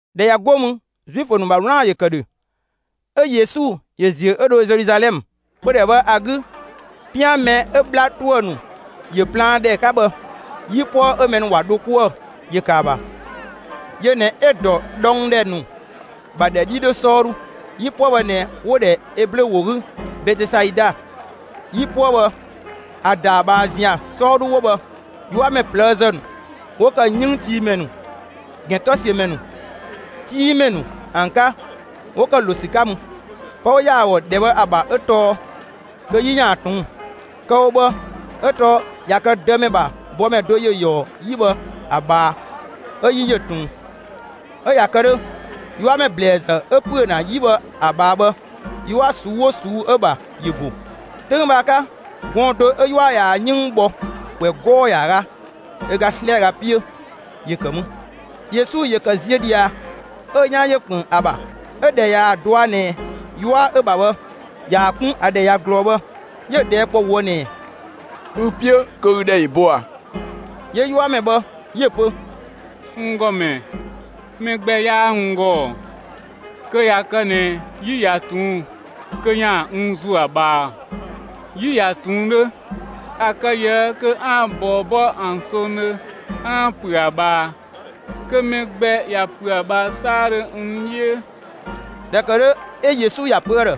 ꞊Dhɛ ꞊ya 'go mü, Zuifö ‑nu ‑bha 'wlaan‑ ‑yö ‑kë ‑dhö, 'ö Yesu ‑yö ‑ziö 'ö dho Zeluzalɛmë. Pödhɛ bhë ‑a 'gü, 'pian mɛ 'ö 'bhla ‑tuë ‑nu ‑yö plaan ‑dhɛ 'ka bhë, 'yipuë 'ö mɛ ‑nu ‑wa dho 'kuë‑ ‑yö ‑kë ‑a ‑bha; yö ꞊nɛ 'ö‑ ‑dɔ dhɔngdhɛ ‑nu ‑bha ‑dhɛ 'dhi 'dhö 'sɔɔdhu. 'Yipuë bhë ꞊nɛ 'wo‑ ‑dhɛ Eblö ‑wo 'gü «Betesaida». 'Yipuë bhë, ‑a ‑da ‑a ꞊bhaa ‑zian 'sɔɔdhu 'wo bhë, 'yuamɛ ꞊plëëzë ‑nu 'wo ‑kë 'yënngtiimɛ ‑nu, ‑gɛntɔsiömɛ ‑nu, 'tinngmɛ ‑nu ‑an 'ka ‑wo ‑kë ‑lo ‑sü 'ka mü. [Pë 'wo ‑ya ‑a ‑gɔ ‑dhɛ bhë ‑a ‑bha 'ö tɔɔ kö 'yi ‑yaan ꞊tuun'‑. Kë‑ wo bhë 'ö tɔɔ, ꞊ya kë Dëmɛ ‑bha bɔmɛ do ‑yö ‑yɔɔ 'yi bhë ‑a ꞊bhaa 'ö 'yi ‑yö ꞊tuun. 'Ö ꞊ya kë 'dhö, 'yuamɛ ‑blɛɛzë 'ö ‑püö ‑na 'yi bhë ‑a ꞊bhaa bhë, 'yua ꞊suu'‑ 'oo ꞊suu'‑ 'ö‑ ‑bha, ‑yö ‑bo.] 'Töng bhë ‑a 'ka, gɔɔn‑ do 'ö 'yua ꞊yaa‑ 'yënng bhɔ ‑kwɛ 'gɔɔ‑ ‑yaaga ö ga 'slɛaga 'piö ‑yö ‑kë mü. Yesu ‑yö ‑kë ziö ꞊dhia, 'ö‑ 'yan ‑yö ‑kpën ‑a ‑bha. 'Ö ꞊dhɛ ꞊yaa‑ dɔa ꞊nɛ 'yua 'ö‑ ‑bha bhë ꞊yaa‑ 'kun ‑a ‑dhɛ ꞊ya ꞊glɔɔ bhë, 'yö‑ ꞊dhɛɛ' kpɔ ꞊woë' ꞊nɛɛ: «ü‑ 'piö kö ü ‑dhɛ ‑yö bo ꞊a?» 'Yö 'yuamɛ bhë 'yö‑ pö: «N ‑Gɔmɛ, mɛ gbɛ 'yaa n ‑gɔ, kö ꞊ya kë ꞊nɛ 'yi ꞊ya ꞊tuun' kö ‑yaan n ‑zuö ‑a ꞊bhaa. 'Yi ꞊ya ꞊tuun 'dhö, ‑a kë ꞊yië' kö 'aan‑ ꞊bɔɔ 'bɔ ‑an songdhö 'aan‑ ‑püö ‑a ꞊bhaa kö mɛ gbɛ ꞊ya ‑püö ‑a ꞊bhaa 'saadhö n 'dhiö.» ꞊Dhɛ ‑kë 'dhö 'ö Yesu ‑ya pö ‑a ‑dhë: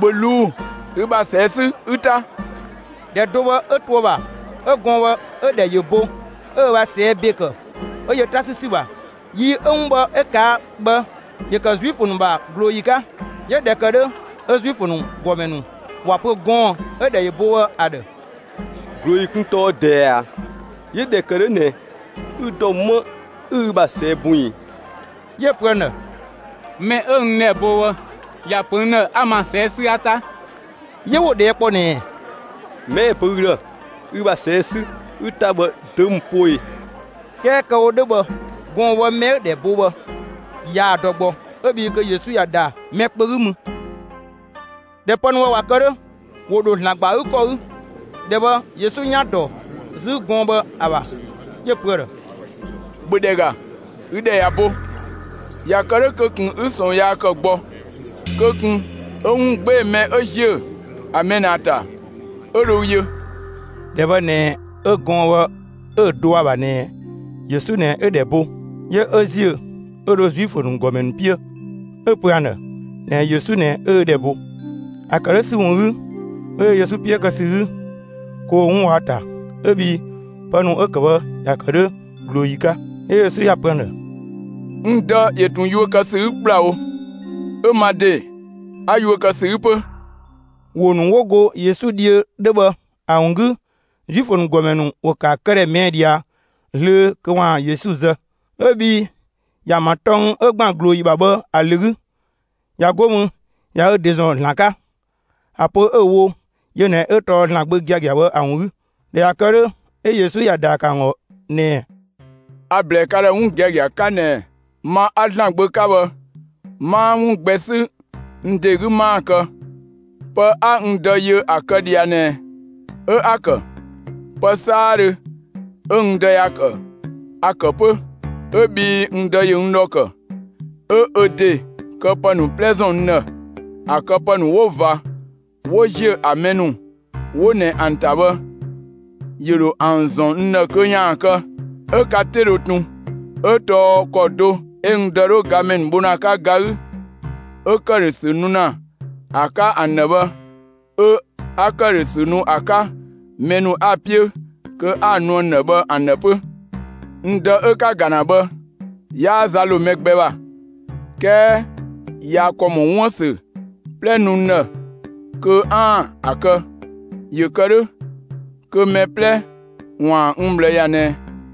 «‑Bhö ꞊luu'‑; ü ‑bha ꞊sɛɛ' 'sü 'ü 'ta.» ‑Dhɛ do bhë 'ö to ‑a ‑bha 'ö gɔɔn‑ bhë, 'ö‑ ‑dhɛ ‑yö bo; 'ö ö ‑bha ꞊sɛɛ' ‑be ‑kë 'ö yö 'ta 'sü ‑sü ‑bha. Yi 'Ö 'wun bhë 'ö ꞊kaa' bhë, ‑yö ‑kë Zuifö ‑nu ‑bha ꞊glooyi 'ka. 'Yö ꞊dhɛ ‑kë 'dhö, 'ö Zuifö ‑nu ‑gɔmɛ ‑nu ‑wa pö gɔɔn‑ 'ö‑ ‑dhɛ ‑yö bo bhë ‑a ‑dhë: «꞊Glooyi kun tɔɔ ꞊dɛɛ ꞊a? 'Yö ꞊dhɛ ‑kë 'dhö ꞊nɛ ü ‑dɔ 'më 'ü ü ‑bha ꞊sɛɛ' bun ꞊i?» 'Yö‑ pö ‑an ‑dhë: «Mɛ 'ö n ‑dhɛ bo bhë ‑ya ‑pö n ‑dhë 'a n ‑ma ꞊sɛɛ' 'sü 'a 'ta.» 'Yö 'wo‑ ꞊dhɛɛ' kpɔ ꞊nɛɛ: «Mɛ 'ö‑ pö ü ‑dhë: ‹Ü ‑bha ꞊sɛɛ' 'sü, 'ü 'ta bhë› dö ‑mü poo ꞊e?» 'Kɛɛ kë‑ wo 'dhö bhë gɔɔn‑ bhë, mɛ 'ö‑ ‑dhɛ bo bhë yaa‑ dɔ gbɔ 'ö bhii kö Yesu ꞊ya ‑da mɛ kpö 'gü mü. ꞊Dhɛ 'ö pë ‑nu bhë ꞊wa kë 'dhö, ‑wo ‑dho ‑Zlan ‑gba ‑a 'gü ‑kɔ 'gü. ‑Dhɛ bhë Yesu 'yan ‑yö ‑dɔ 'zü gɔɔn‑ bhë ‑a ‑bha. 'Yö‑ pö ‑a ‑dhë: «‑Bhö ‑dhɛ ‑ga! Ü ‑dhɛ ꞊ya bo; ꞊ya kë 'dhö kö ꞊kun 'ü ꞊sɔɔn yaa ‑kë gbɔ, kö ꞊kun 'ö 'wun 'gbee‑ mɛ 'ö ‑ziö ‑a mɛ ꞊nɛ ‑a ‑ta 'ö dho ü yö.» (‑Dhɛ bhë ꞊nɛ 'ö gɔɔn‑ bhë 'ö dɔa ‑bha ꞊nɛ Yesu ꞊nɛ 'ö‑ ‑dhɛ bo,) 'yö 'ö ‑ziö 'ö dho Zuifö ‑nu ‑gɔmɛ ‑nu 'piö 'ö‑ pö ‑an ‑dhë ꞊nɛɛ Yesu ꞊nɛ 'ö‑ ‑dhɛ bo. ‑A ‑kë 'dhö ‑sü ‑wun 'gü, 'wo yö Yesu 'piö kë ‑sü 'gü kö ‑wo 'wun wɔ ‑a ‑ta 'ö bhii pë ‑nu 'ö‑ kë bhë ‑ya ‑kë 'dhö ꞊glooyi 'ka. 'Yö Yesu ‑ya pö ‑an ‑dhë: «N Dë ‑yö ꞊tun yuö kë ‑sü 'gü ‑kplawo; 'ö ma ‑de, 'a yuö kë ‑sü 'gü 'pö.» ‑Wo ‑nu 'wo go Yesu dhiö 'dhö bhë ‑a ‑wun 'gü, Zuifö ‑nu ‑gɔmɛ ‑nu ‑wo ‑kë ‑a këdhɛ ꞊mɛɛ' ꞊dhia zlöö kö ‑waan Yesu zë. 'Ö bhii ꞊ya ‑an ‑bha tɔng 'ö ‑gban ꞊glooyi ‑bha bhë ‑a ‑lö 'gü, ꞊ya 'go mü ꞊ya ö ‑de ‑zɔn ‑Zlan 'ka, ‑a pö 'ö‑ wo yö ꞊nɛ 'ö tɔɔ ‑Zlan Gbö gia‑ bhë ‑a ‑wun 'gü. ꞊Dhɛ ꞊ya kë 'dhö, 'ö Yesu ‑ya ‑daa ‑kë ‑an ‑gɔ ꞊nɛɛ: «A‑ ‑blɛɛ ka ‑dhë 'wun giagia 'ka ꞊nɛ ma 'a ‑Zlan Gbö 'ka bhë 'maa 'wun gbɛ 'sü n ‑de 'gü 'maa‑ kë; pë 'a n Dë yö ‑a kë ꞊dhia ꞊nɛ 'ö 'a‑ ‑kë. Pë 'saadhö 'ö n Dë ‑ya ‑kë, a‑ ‑kë 'pö. 'Ö bhii n Dë ‑yö n ‑dhɔ ‑kë, 'ö ö ‑de këpë ‑nu 'plɛ ‑zɔn n ‑dhë. ‑A këpë ‑nu 'wo ꞊va, 'wo ‑ziö ‑a mɛ ‑nu 'wo ꞊nɛ ‑an ‑ta bhë, ‑yö ‑dho ‑an ‑zɔn n ‑dhë kö ‑yaan kë; 'ö ka 'te dhö tun. 'Ö tɔɔ ‑kɔ do 'ö n Dë 'dhö gamɛ ‑nu bho ‑na ‑a 'ka ga 'gü 'ö ‑këdhösü nu ‑na ‑a 'ka ‑an ‑dhë bhë, 'ö 'a ‑këdhösü nu ‑a 'ka mɛ ‑nu 'a‑ 'piö kö 'a‑ nu ‑an ‑dhë bhë ‑an ‑dhë 'pö. N Dë 'ö 'ka‑ ‑ga ‑na bhë, 'yaa za ‑lo mɛ gbɛ ‑bha; 'kɛɛ ꞊ya ‑kɔ ‑mɔ 'wuën‑ ‑sü 'plɛ nu n ‑dhë kö 'aan‑ ‑a kë, ‑yö kë 'dhö kö mɛ 'plɛ ‑waan n ꞊bhlë ‑ya ꞊nɛ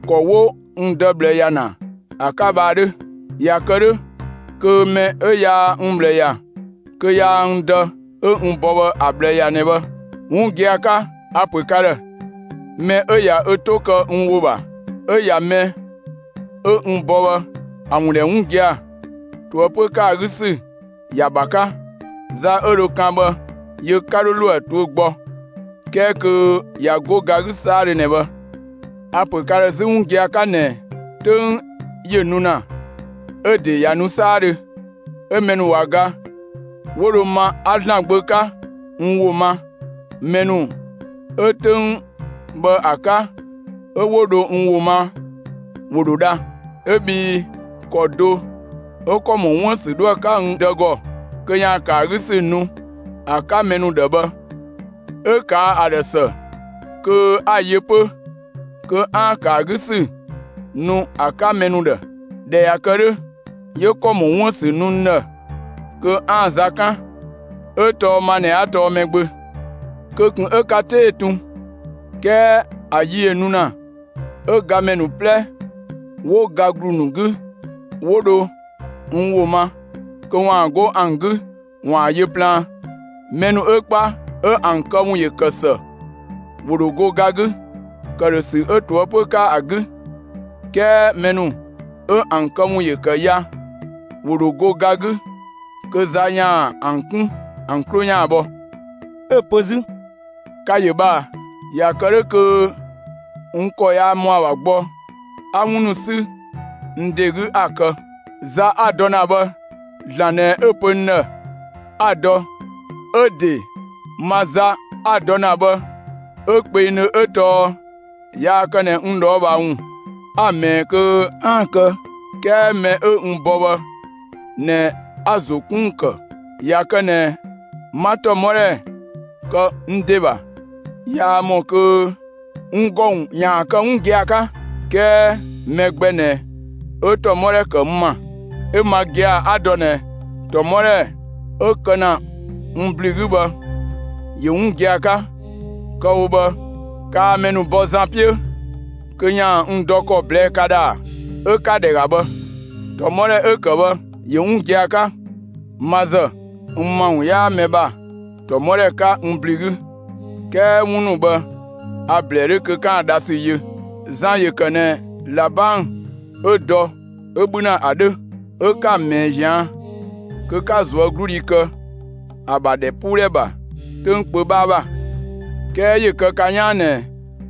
‑kɔ 'wo n Dë ꞊bhlë ‑ya ‑na ‑a 'ka bhë ‑a 'dhö. ꞊Ya kë 'dhö, kö mɛ 'ö yaa n ꞊bhlë ‑ya, kö yaa n Dë 'ö n bɔ bhë ‑a ꞊bhlë ‑ya ꞊nɛ bhë. 'Wun gia‑ 'ka, a‑ ‑pö ka ‑dhë: Mɛ 'ö ꞊ya ö 'to kë n ‑wo ‑bha, 'ö ꞊ya mɛ 'ö n bɔ bhë ‑a ‑wun ‑dhɛ 'wun gia‑, ꞊toëpö ‑kë ‑a 'gü ‑sü ‑ya ‑bha 'ka. Za 'ö dhö kan bhë, yö 'ka 'dho ‑lo ‑a tuö gbɔ; 'kɛɛ kö ꞊ya 'go ga 'gü 'saadhö ꞊nɛ bhë. A‑ ‑pö ka ‑dhë 'zü 'wun gia‑ 'ka ꞊nɛ 'töng ‑yö nu ‑na, 'ö‑ ‑de ꞊ya nu 'saadhö, 'ö mɛ ‑nu ꞊wa ga 'ö 'wo dho ma 'a ‑Zlan Gbö 'ka n ‑wo ma; mɛ ‑nu 'ö 'töng bhë ‑a 'ka 'ö 'wo dho n ‑wo ma, ‑wo ‑dho dha. 'Ö bhii ‑kɔ do 'ö ‑kɔ ‑mɔ 'wuën‑ ‑sü 'dhoë‑ 'ka n Dë ‑gɔ kö ‑yaan ‑kë ‑a 'gü ‑sü nu ‑a 'ka mɛ ‑nu ‑dhë bhë, 'ö ꞊kaa' ‑a ‑dhë ‑së kö 'a‑ yö 'pö kö 'aan‑ ‑kë ‑a 'gü ‑sü nu ‑a 'ka mɛ ‑nu ‑dhë. ꞊Dhɛ ꞊ya kë 'dhö, 'yö ‑kɔ ‑mɔ 'wuën‑ ‑sü nu n ‑dhë kö 'aan‑ za 'kan; 'ö tɔɔ ma ꞊nɛ 'a tɔɔ Mɛgbö. Kö ꞊kun 'ö ka 'te ‑yö tun; 'kɛɛ ‑a yi ‑yö nu ‑na 'ö gamɛ ‑nu 'plɛ 'wo ga ‑glu ‑nu 'gü, 'wo dho n ‑wo ma, kö ‑waan 'go ‑an 'gü ‑waan yö plaan. Mɛ ‑nu 'ö 'kpa, 'ö ‑an këwun ‑yö ‑kë ‑së, ‑wo ‑dho go ga 'gü ‑këdhösü 'ö ꞊toëpö 'ka ‑a 'gü; 'kɛɛ mɛ ‑nu 'ö ‑an këwun ‑yö ‑kë ya, ‑wo ‑dho go ga 'gü kö za ‑yaan ‑an 'kun ‑an 'klo ‑yaan bhɔ.» 'Ö‑ pö 'zü: «Ka‑ ‑yö bhë ꞊a? ꞊Ya kë 'dhö kö n ‑kɔ yaa ‑mɔa ‑bha gbɔ 'a 'wun ‑nu 'sü n ‑de 'gü 'a‑ kë. Za 'a‑ dɔ ‑na bhë, ‑Zlan ꞊nɛ 'ö‑ pö n ‑dhë 'a‑ dɔ, 'ö‑ ‑de ma za 'a‑ dɔ ‑na bhë 'ö kpengdhö 'ö tɔɔ yaa kë ꞊nɛ n ꞊dhɔɔbhaa ‑wun 'a‑ ꞊mɛɛ'‑ kö 'aan‑ kë; 'kɛɛ mɛ 'ö n bɔ bhë ꞊nɛ 'a‑ ‑zo 'kun ‑wun ‑kë. ꞊Ya kë ꞊nɛ 'ma ‑tɔmɔdhɛ kë n ‑de ‑bha, yaa ‑mɔ kö n ‑gɔ ‑wun ‑yaan kë 'wun gia‑ 'ka. 'Kɛɛ mɛ gbɛ ꞊nɛ 'ö ‑tɔmɔdhɛ ‑kë n ‑ma, 'ö ma gia‑ 'a‑ dɔ ꞊nɛ ‑tɔmɔdhɛ 'ö‑ kë ‑na n ‑blü 'gü bhë, ‑yö 'wun gia‑ 'ka. Kë‑ wo bhë, kaa mɛ ‑nu bɔ Zan 'piö kö ‑yaan n dɔ ‑kɔ ꞊blɛɛ ka ‑dhë ‑a? 'Ö ‑ka ‑dhɛ ‑ga bhë! ‑Tɔmɔdhɛ 'ö‑ kë bhë ‑yö 'wun gia‑ 'ka. Ma ‑zë, n ‑ma ‑wun 'yaa‑ 'ka mɛ ‑bha ‑tɔmɔdhɛ 'ka n ‑blü 'gü, 'kɛɛ 'wun ‑nu bhë a‑ ‑blɛɛ 'dhö kö 'kaan‑ dhasü yö. Zan ‑yö ‑kë ꞊nɛ ꞊labang 'ö dɔ, 'ö 'bhü ‑na ‑a 'dhö. 'Ö 'ka‑ ꞊mɛɛ ꞊zian' kö 'ka ꞊zuögludhi kë ‑a ‑bha ‑dhɛpuudhɛ ‑bha 'töng kpö 'bhaa ‑bha. 'Kɛɛ ‑yö kë ka 'yaan ꞊nɛ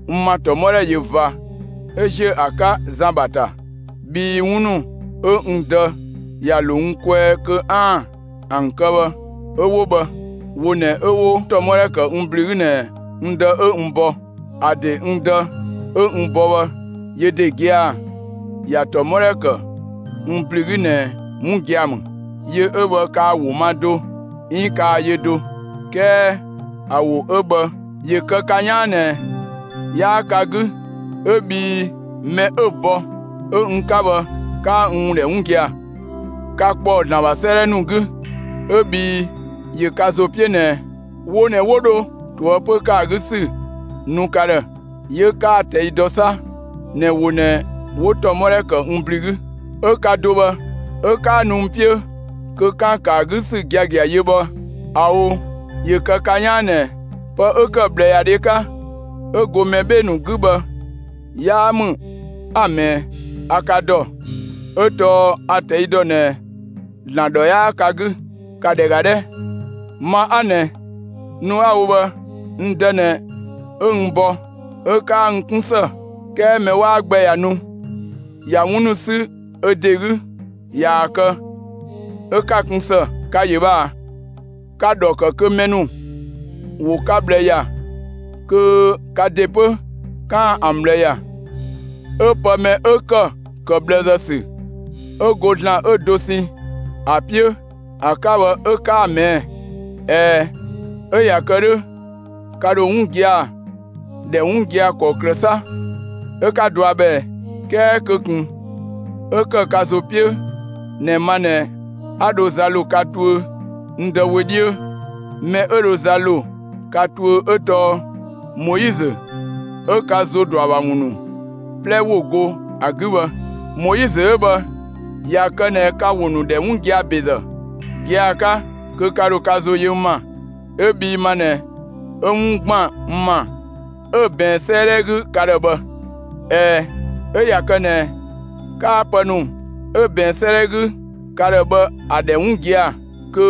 n ‑ma ‑tɔmɔdhɛ ꞊yö ꞊va 'ö ‑ziö ‑a 'ka Zan ‑bha ‑ta; bhii 'wun ‑nu 'ö n Dë ‑ya ‑lo n kwɛɛ kö 'aan‑ ‑an kë bhë, 'ö 'wo bhë, wo ꞊nɛ 'ö 'wo ‑tɔmɔdhɛ ‑kë n ‑blü 'gü ꞊nɛ n Dë 'ö n bɔ. ‑A ‑de n Dë 'ö n bɔ bhë, yö ‑de gia‑ ꞊ya ‑tɔmɔdhɛ kë n ‑blü 'gü ꞊nɛ 'wun gia‑ ‑mü. Yö 'ö bhë, kaa‑ ‑wo ma do 'iin kaa‑ yö do. 'Kɛɛ ‑a ‑wo 'ö bhë, ‑yö kë ka 'yaan ꞊nɛ 'yaa ka 'gü 'ö bhii mɛ 'ö‑ bɔ ('ö n 'ka bhë), 'kaa n ‑wun ‑dhɛ 'wun gia‑. Ka ‑kpɔɔ ‑Zlan ‑bha 'sëëdhɛ ‑nu 'gü, 'ö bhii ‑yö ka ‑zo 'piö ꞊nɛ wo ꞊nɛ 'wo dho ꞊toëpö ‑kë ‑a 'gü ‑sü nu ka ‑dhë; 'yö 'kaa‑ ꞊tɛi' dɔ 'sa ꞊nɛ wo ꞊nɛ 'wo ‑tɔmɔdhɛ ‑kë n ‑blü 'gü. 'Ö 'ka dɔ bhë 'ö 'kaa nu n 'piö kö 'kaan‑ ‑kë ‑a 'gü ‑sü giagia yö bhë, ꞊ao'! ‑Yö kë ka 'yaan ꞊nɛ, pë 'ö ‑kë ꞊bhlëyadhɛ 'ka 'ö go mɛ 'bhee‑ ‑nu 'gü bhë 'yaa ‑mü 'a‑ ꞊mɛɛ. A ka ‑dɔ; 'ö tɔɔ a‑ ꞊tɛi' ‑dɔ ꞊nɛ ‑Zlan ‑dhɔ 'yaa ka 'gü. ‑Ka ‑dhɛ ‑ga 'dhɛ! Ma 'a ꞊nɛ, nu 'a‑ wo bhë, n Dë ꞊nɛ 'ö n bɔ; 'ö 'kaa n 'kun ‑së. 'Kɛɛ mɛ 'waa gbɛ ꞊ya ‑nu, ꞊ya 'wun ‑nu 'sü ö ‑de 'gü ꞊yaa‑ kë, 'ö 'ka‑ kun ‑së. Ka‑ ‑yö bhë ꞊a? Ka‑ ‑dhɔ ‑kë kö mɛ ‑nu ‑wo ka ꞊bhlë ‑ya kö ka ‑de 'pö 'kaan‑ ‑an ꞊bhlë ‑ya; 'ö pë mɛ 'ö ‑kë ‑kë ꞊bhlëzë ‑sü 'ö go ‑Zlan 'ö dosɛn ‑a 'piö ‑a 'ka bhë 'ö 'kaa‑ ꞊mɛɛ'‑. ꞊Ɛɛ, 'ö ꞊ya kë 'dhö ka ‑dho 'wun gia‑ ‑dhɛ 'wun gia‑ ‑kɔklë 'sa 'ö 'ka dɔa bhë ꞊ɛɛ? 'Kɛɛ kö ꞊kun 'ö ‑kë ka ‑zo 'piö ꞊nɛ ma ꞊nɛ 'a dho za ‑lo ka tuö n Dë wö 'dhiö; mɛ 'ö dho za ‑lo ka tuö 'ö tɔɔ Moizö 'ö ka ‑zo ‑dɔ ‑a ‑bha ‑wun ‑nu 'plɛ ‑wo go ‑a 'gü bhë. Moizö 'ö bhë, ꞊ya kë ꞊nɛ ka‑ ‑wo ‑nu ‑dhɛ 'wun gia‑ ‑bezë (gia‑ 'ka) kö ka ‑dho ka ‑zo yö n ‑ma, 'ö bhii ma ꞊nɛ 'ö 'wun ‑gban n ‑ma, 'ö‑ ꞊bɛɛn 'sëëdhɛ 'gü ka ‑dhë bhë. ꞊Ɛɛ, 'ö ꞊ya kë ꞊nɛ 'kaa pë ‑nu 'ö ꞊bɛɛn 'sëëdhɛ 'gü ka ‑dhë bhë ‑a ‑dhɛ 'wun gia‑ kö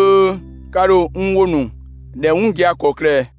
ka ‑dho n ‑wo ‑nu ‑dhɛ 'wun gia‑ ‑kɔklë ꞊ɛɛ?»